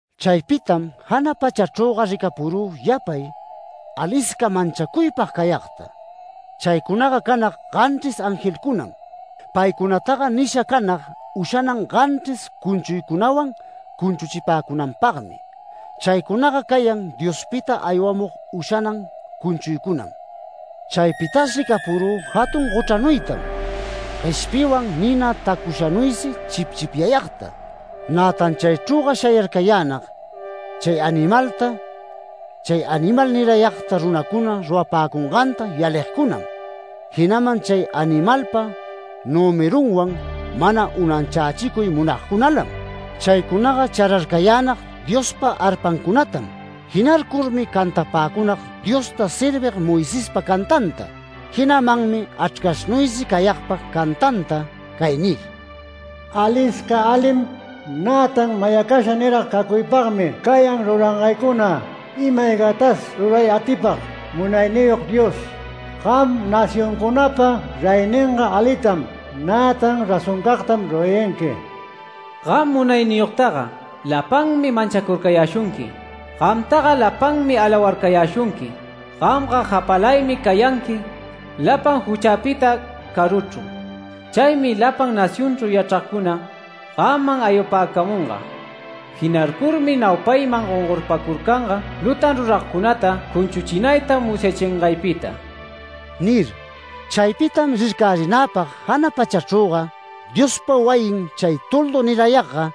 Chaypitam jana pachachrüga ricapurü yapay, alisca manchacuypag cayagta. Chaycunaga canag ganchris angelcunam. Paycunataga nisha canag ushanan ganchris cunchuycunawan cunchuchipäcunanpagmi. Chaycunaga cayan Diospita aywamug ushanan cunchuycunam. Chaypitas ricapurü jatun gochranuytam, gueshpiywan nina tacushanuysi chipchipyagta. Nätan chaychrüga shayarcayänag, chay animalta, chay animal nirayagta runacuna rurapäcunganta yaligcunam, jinaman chay animalpa nümerunwan mana unanchächicuy munagcunalam. Chaycunaga chararcayänag Diospa arpancunatam. Jinarcurmi cantapäcunag Diosta servig Moisespa cantanta, jinamanmi Achrcashnuysi cayagpa cantanta cay nir: “Alisca alim, nätan mayacasha nirag cacuypagmi cayan rurangaycuna, ima-aygatas ruray atipag Munayniyog Dios. Gam nacioncunapa reyninga alitam, nätan razoncagtam rurayanqui. Gam munayniyogtaga lapanmi manchacurcayäshunqui. Gamtaga lapanmi alawarcayäshunqui, Gamga japalaymi cayanqui lapan juchapita caruchru. Chaymi lapan nacionchru yachragcuna gamman aywapäcamunga. Jinarcurmi naupayman gongorpacurcanga lutan ruragcunata cunchuchinayta musyachingaypita” nir. Chaypitam rircarinäpag jana pachachrüga Diospa wayin chay toldu nirayagga,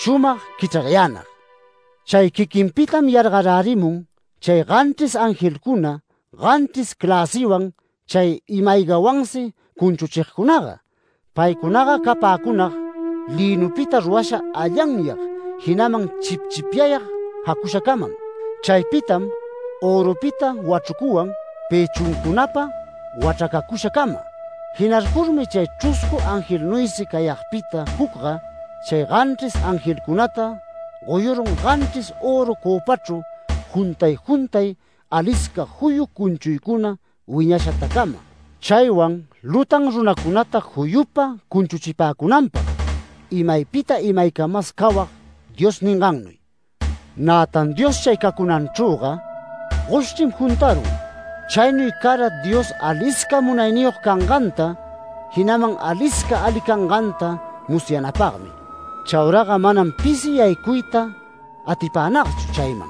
shumag quichrarayänag. Chay quiquinpitam yargarärimun chay ganchris angelcuna ganchris cläsiwan chay ima-aygawansi cunchuchigcunaga. Paycunaga capäcunag lïnupita rurasha allanyag, jinaman chipchipyag jacushacamam. Chaypitam örupita wachrucuwan pëchuncunapa wachracacusha cama. Jinarcurmi chay chruscu angelnuysi cayagpita jucga, chay ganchris angelcunata goyurun ganchris öru cöpachru juntay juntay alisca juyu cunchuycuna wiñashatacama, chaywan lutan runacunata juyupa cunchuchipäcunanpag, imaypita imaycamas cawag Dios ningannuy. Nätan Dios chay cacunanchrüga goshchrim juntarun. Chaynuy cara Dios alisca munayniyog canganta, jinaman alisca ali canganta musyanapagmi. Chauraga manam pisi yaycuyta atipänagchu chayman,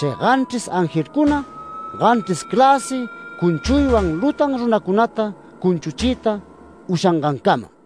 chay ganchris angelcuna, ganchris cläsi cunchuywan lutan runacunata cunchuchiyta ushangancama.